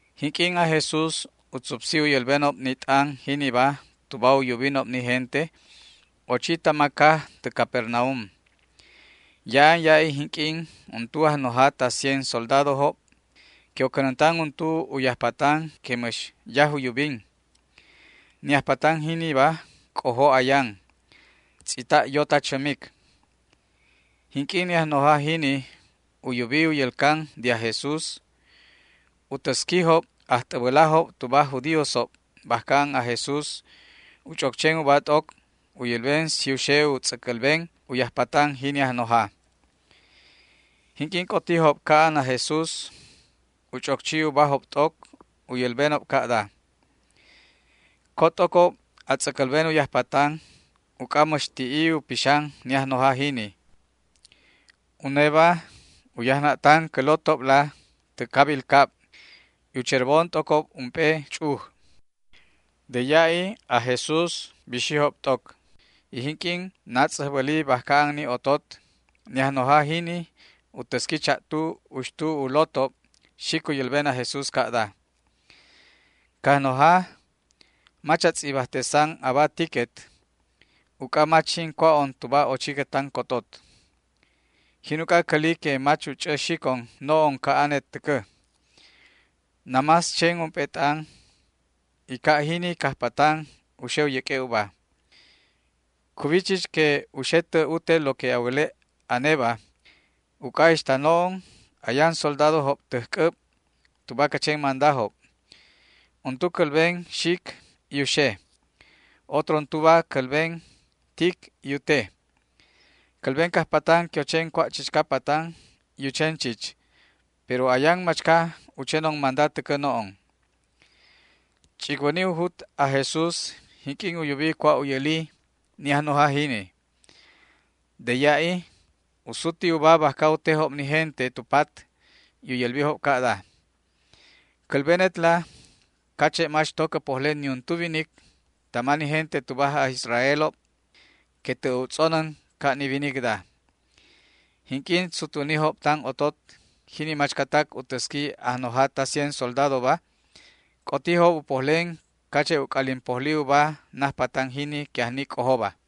Jinq'uin aj Jesús u tzupsi u yälbenob ni t'an jiniba tuba u yubinob ni gente, ochi tama caj tä Capernaum. Ya'an ya'i jinq'uin untu ajnoja ta cien soldadojob que u cänäntan untu u yajpatan que mäx yaj u yubin. Ni ajpatan jiniba c'ojo ayan, tz'ita' yo ta chämic. Jinq'uin ni ajnoja jini u yubi u yälcan de aj Jesús, u täsquijob ajt'äbälajob tuba aj judíosob bajca an aj Jesús u ch'oc chen uba t'oc u yälben si u xe u tz'äcälben u yajpatan jini ajnoja. Jinq'uin c'otijob ca'an aj Jesús u ch'oc chi ubajob t'oc u yälbenob ca'da: ―Co t'ocob a tz'äcälben u yajpatan uc'a mäx ti'i u pixan ni ajnoja jini. Uneba u yajna'tan cä lotobla täj cabil cabla y u cherbon t'ocob ump'e ch'uj. De ya'i aj Jesús bixijob t'oc, y jinq'uin natz'äjbäli bajca an ni otot, ni ajnoja jini u täsqui cha'tu uxtu u lotob xic u yälben aj Jesús ca'da: ―Cajnoja, mach a tz'ibajtesan aba tiquet, uc'a mach jin cua'on tuba ochiquet tan cotot. Jin uc'a cäli que mach u ch'ä xicon no'on ca'anet täcä. Namás chen ump'e t'an y ca' jini cajpatan u xe u yäq'ue' uba. Cuwi chich que u xe tä ute lo que a wäle' aneba, uc'a ixta no'on ayan soldadojob täj c'äb tuba cä chen mandajob. Untu cälben xic y u xe. Otro untuba cälben tic y u te. Cälben cajpatan que u chen cua' chichca patan y u chen chich, pero ayan machca u chenon manda täcä no'on. Ch'icwäni u jut aj Jesús jinq'uin u yubi cua' u yäli ni ajnoja jini. De ya'i u suti uba bajca u tejob ni gente tu pat y u yälbijob ca'da: ―Cälbenetla cache' mach to cä pojle niuntu winic tama ni gente tuba aj Israelob que tä' u tz'onän ca' ni winicda. Jinq'uin sutwänijob tan otot jini machcatac u täsqui ajnoja ta cien soldadoba, c'otijob u pojlen cache' u c'alin pojli uba najpatan jini que ajni c'ojoba.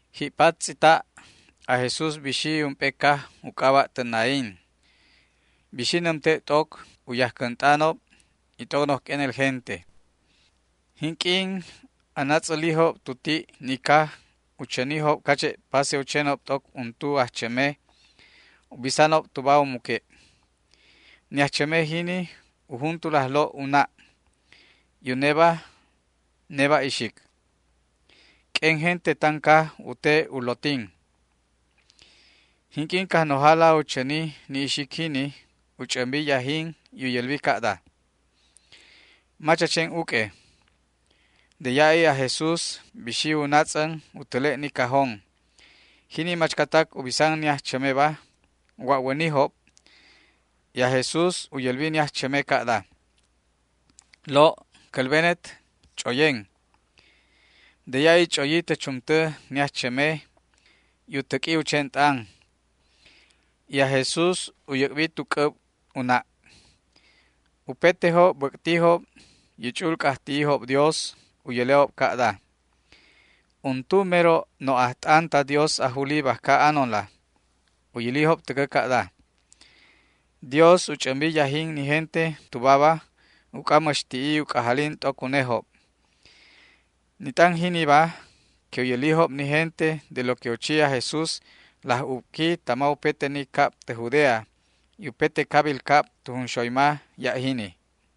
Ji'pat tz'ita' aj Jesús bixi ump'e caj u c'aba' tä Naín. Bixi nämte' t'oc u yajcänt'anob y t'oc noj q'uenel gente. Jinq'uin anatz'älijob tu ti' ni caj u chänijob cache' pase u chenob t'oc untu ajchäme u bisanob tuba u muque'. Ni ajchäme jini u juntul ajlo' u na', y uneba neba' ixic une. U tejob t'oc u lotin noj q'uenel gente ta ni caj. Jinq'uin Cajnojala u chäni ni ixic jini, u ch'ämbi yajin y u yälbi ca'da: ―Mach a chen uq'ue. De ya'i aj Jesús bixi u natz'än u täle' ni cajón. Jini machcatac u bisan ni ajchämeba wa'wänijob y aj Jesús u yälbi ni ajchäme ca'da: ―Lo', cälbenet: Ch'oyen. De ya'i ch'oyi tä chumtä ni ajchäme y u täq'ui u chen t'an y aj Jesús u yäc'bi tu c'äb u na'. Upetejob bäc'tijob y u ch'u'ul c'ajti'ijob Dios u yäle'ob ca'da: ―Untu mero no' ajt'an ta Dios ajuli bajca anonla. U yälijob täcä ca'da: ―Dios u ch'ämbi yajin ni gente tubaba uc'a mäx ti'i u c'ajalin t'oc unejob. Ni t'an jiniba que u yälijob ni gente de lo que u chi aj Jesús laj ubqui tama upete ni cab tä Judea, y upete cabil cab tu junxoyma ya' jini.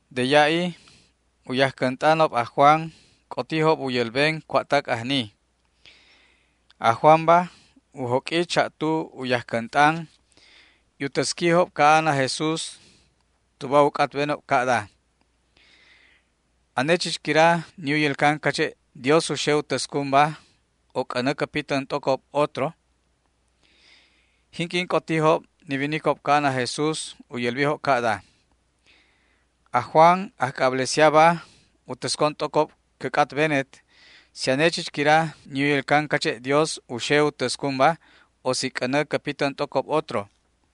De ya'i u yajcänt'anob aj Juan c'otijob u yälben cua'tac ajni. Aj Juanba u joq'ui cha'tu u yajcänt'an y u täsquijob ca'an aj Jesús tuba u c'atbenob ca'da: “¿Ane chich quira ni u yälcan cache' Dios u xe u täscunba, o c'änä cä pitän t'ocob otro?” Jinq'uin c'otijob ni winicob ca'an aj Jesús u yälbijob ca'da: ―Aj Juan ajc'ablesiaba u täscon t'ocob cä c'atbenet si ane chich quira ni u yälcan cache' Dios u xe u täscunba, o si c'änä cä pitän t'ocob otro.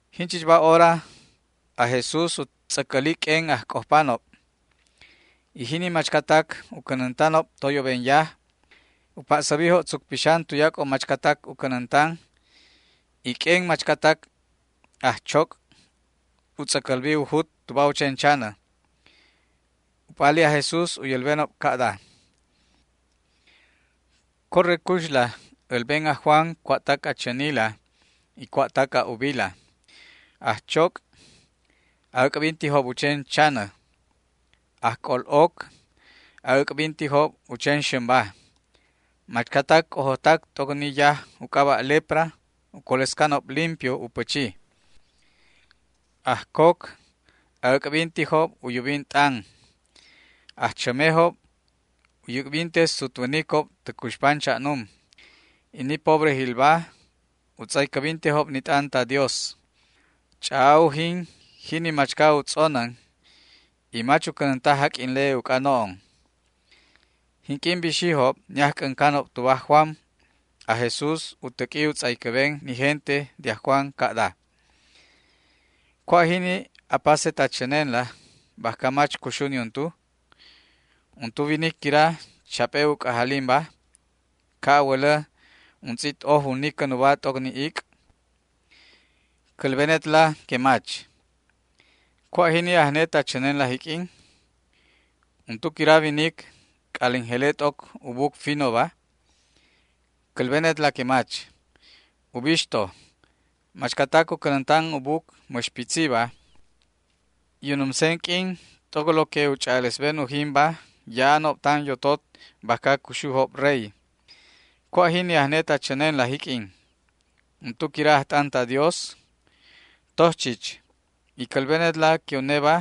Jinchichba hora aj Jesús u tz'äcäli q'uen ajc'ojpanob y jini machcatac u cänäntanob toyoben yaj. U pa'säbi tzuc pixan tuyac'o machcatac u cänäntan, y q'uen machcatac ajchoc' u tz'äcälbi u jut tuba u chen chanä. U p'ali aj Jesús u yälbenob ca'da: ―Corre cuxla älben aj Juan cua'tac a chänila y cua'tac a ubila: ajchoc' a'äc'bintijob u chen chanä, ajc'ol'oc a'äc'bintijob u chen xämba, machcatac c'ojojtac t'oc ni yaj u c'aba' lepra u colescanob limpio u pächi, ajcoc a'äc'bintijob u yubin t'an, ajchämejob u yäc'binte sutwänicob tä cuxpan cha'num, y ni pobrejilba u tz'aycäbintejob ni t'an ta Dios. Ch'a'a ujin jini machca u tz'onän y mach u cänänta jaq'uinle uc'a no'on. Jinq'uin bixijob ni ajc'äncanob tuba aj Juan, aj Jesús u täq'ui u tz'aycäben ni gente de aj Juan ca'da: ―¿Cua' jini apaset a chänenla bajca mach cuxu niuntu? ¿Untu winic quira chap'e u c'ajalinba, ca' a wälä untz'it oj u nicän uba t'oc ni ic'? Cälbenetla que mach. ¿Cua' jini ajnet a chänenla jiq'uin? ¿Untu quira winic c'alin jele t'oc u buc finoba? Cälbenetla que mach. Ubixto, machcatac u cänäntan u buc mäx pitziba y u numsen q'uin t'oc lo que u ch'a'alesben ujinba ya'anob tan yotot bajca cuxujob rey. ¿Cua' jini ajnet a chänenla jiq'uin? ¿Untu quira ajt'an ta Dios? Toj chich, y cälbenetla que uneba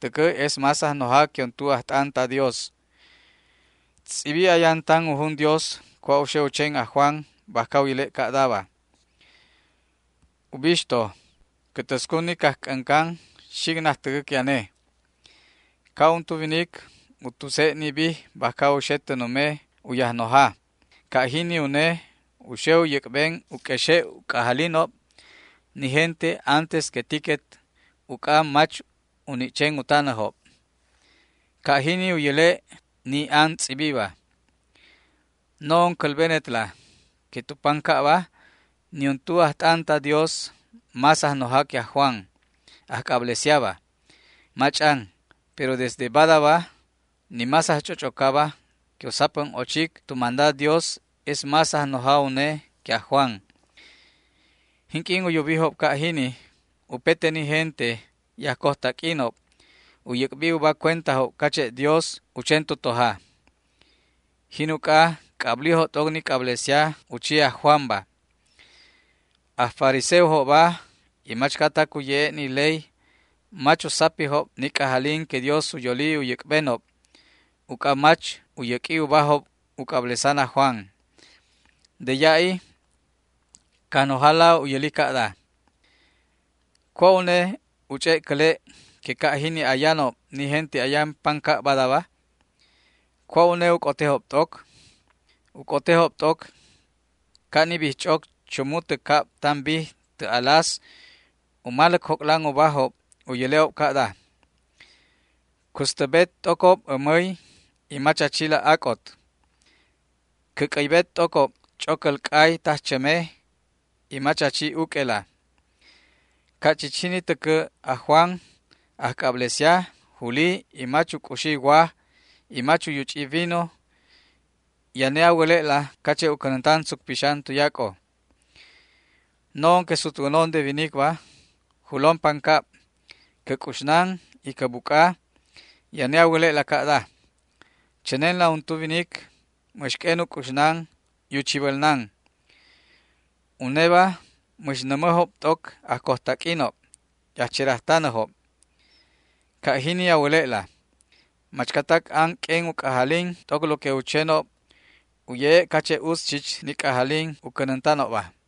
täcä es más ajnoja que untu ajt'an ta Dios. Tz'ibi ayan tan u jun Dios cua' u xe u chen aj Juan bajca u yäle' ca'daba: Ubixto, cä täscun ni cajc'äncan xic najtäcä que ane. Ca' untu winic u tuse' ni bij bajca u xe tä nume u yajnoja, ca' jini une u xe u yäc'ben u q'uexe' u c'ajalinob ni gente antes que tiquet uc'a mach u ni' chen u tanäjob. Ca' jini u yäle' ni an tz'ibiba. No'on cälbenetla que tu pancabba niuntu ajt'an ta Dios más ajnoja que aj Juan ajc'ablesiaba, mach'an, pero desde badaba ni más ajch'och'ocaba que u sapän ochic tu manda Dios es más ajnoja une que aj Juan. Jinq'uin u yubijob ca' jini upete ni gente y ajcojtaq'uinob u yäc'bi uba cuentajob cache' Dios u chen tu toja. Jin uc'a c'ablijob t'oc ni c'ablesia u chi aj Juanba. Aj fariseojobba y machcatac u ye'e' ni ley mach u sapijob ni c'ajalin que Dios u yoli u yäc'benob uc'a mach u yäq'ui ubajob u c'ablesan aj Juan. De ya'i Cajnojala u yäli ca'da: ―¿Cua' une u ch'e' cäle' que ca' jini ayanob ni gente ayan pancab badaba? ¿Cua' une u c'otejob t'oc? U c'otejob t'oc ca' ni bijch'oc chumu tä cab tan bij tä alas u maläc joc'lan ubajob y u yäle'ob ca'da: “Custäbet t'ocob ämäy y mach a chila ac'ot. Cä c'äybet t'ocob ch'ocäl c'ay tajchäme y mach a chi uq'uela”. Ca' chich jini täcä aj Juan ajc'ablesia juli y mach u c'uxi waj y mach u yuch'i vino y ane a wäle'la cache' u cänäntan tzuc pixan tuyac'o. No'on que sutwänon de winicba julon pancab. Cä c'uxnan y cä buc'a y ane a wäle'la ca'da: “Chänenla untu winic mäx q'uen u c'uxnan y u chibälnan. Uneba mäx nämäjob t'oc ajcojtaq'uinob y ajcherajtanäjob”. Ca' jini a wäle'la. Machcatac an q'uen u c'ajalin t'oc lo que u chenob u ye'e' cache' utz chich ni c'ajalin u cänäntanobba.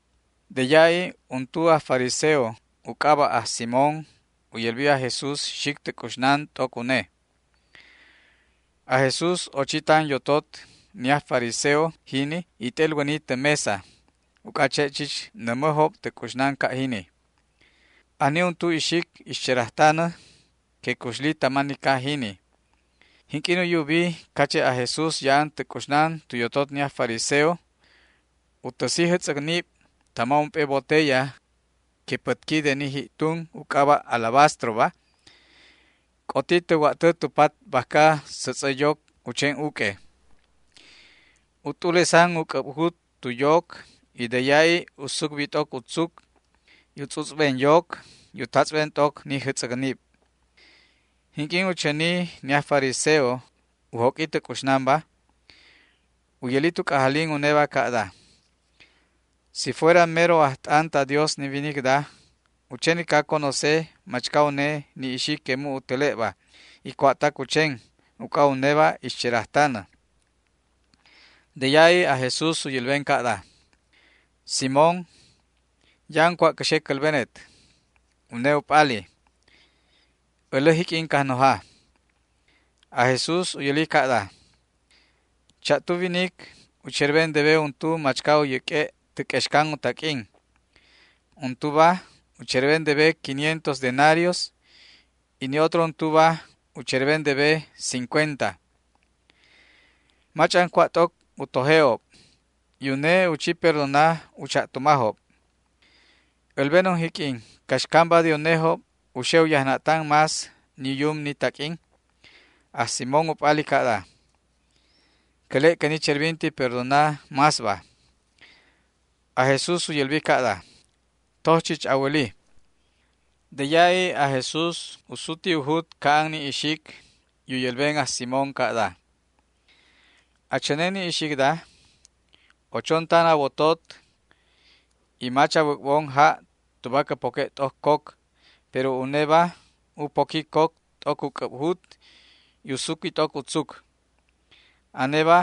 De ya'i untu aj fariseo u c'aba' aj Simón u yälbi aj Jesús xic tä c'uxnan t'oc une. Aj Jesús ochi tan yotot ni aj fariseo jini y t'elwäni tä mesa, uc'a che' chich nämäjob tä c'uxnan ca' jini. Ajni untu ixic ixcherajtanä que cuxli tama ni caj jini. Jinq'uin u yubi cache' aj Jesús ya'an tä c'uxnan tu yotot ni aj fariseo, u täsi jätz'äcnib tama ump'e botella que pätqui de ni ji'tun u c'aba' alabastroba. C'oti tä wa'tä tu pat bajca sätz'ä yoc u chen uq'ue. U t'ulesan u c'äbjut tu yoc y de ya'i u sucbi t'oc u tzuc y u tz'utz'ben yoc y u tatz'ben t'oc ni jätz'äcnib. Jinq'uin u chäni ni aj fariseo u joq'ui tä c'uxnanba, u yäli tu c'ajalin uneba ca'da: “Si fuera mero ajt'an ta Dios ni winicda u chenica conoce machca une ni ixic que mu' u täle'ba, y cua'tac u chen, uc'a uneba ixcherajtanä”. De ya'i aj Jesús u yälben ca'da: ―Simón, ya'an cua' cä xe cälbenet. Une u p'ali: ―Älä jiq'uin, Cajnoja. Aj Jesús u yäli ca'da: ―Cha'tu winic u cherben debe untu machca u yäq'ue' tä q'uexcan u taq'uin. Untuba u cherben debe quinientos denarios y ni otro untuba u cherben debe cincuenta. Mach'an cua' t'oc u toje'ob y une u chi perdona u cha'tumajob. Älbenon jiq'uin caxcamba de unejob u xe u yajna'tan más ni u yum ni taq'uin. Aj Simón u p'ali ca'da: ―Cäle' que ni cherbinti perdona másba. Aj Jesús u yälbi ca'da: ―Toj chich a wäli. De ya'i aj Jesús u suti u jut ca'an ni ixic y u yälben aj Simón ca'da: ―¿A chänen ni ixicda? Ochon tan a wotot y mach a wäc'bon ja' tuba cä poque' t'oc coc, pero uneba u poqui coc t'oc u c'äbjut, y u suqui t'oc u tzuc. Aneba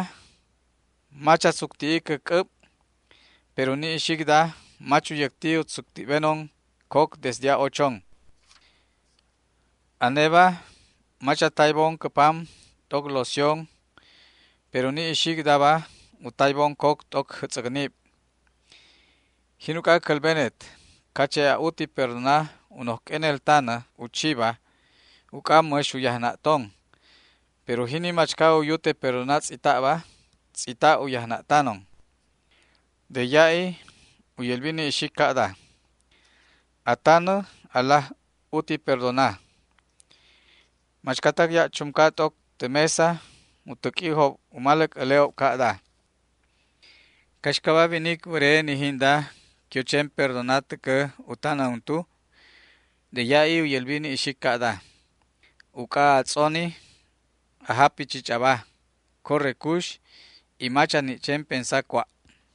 mach a tzucti'i cä c'äb, pero ni ixicda mach u yäcti u tz'utz'benon coc desde a'ochon. Aneba mach a taybon cä pam t'oc loción, pero ni ixicdaba u taybon coc t'oc jätz'äcnib. Jin uc'a cälbenet cache' a'uti perdona u noj q'uenel tanä u chiba uc'a mäx u yajna'tanon, pero jini machca u yute perdona tz'ita'ba, tz'ita' u yajna'tanon. De ya'i u yälbi ni ixic ca'da: ―A tanä alaj uti perdona. Machcatac ya' chumca t'oc tä mesa u täq'uijob u maläc äle'ob ca'da: ―¿Caxcaba winic wäre ni jinda que u chen perdona täcä u tanä untu? De ya'i u yälbi ni ixic ca'da: ―Uc'a a tz'oni, a japi chich aba. Corre cux, y mach a ni' chen pensa cua'.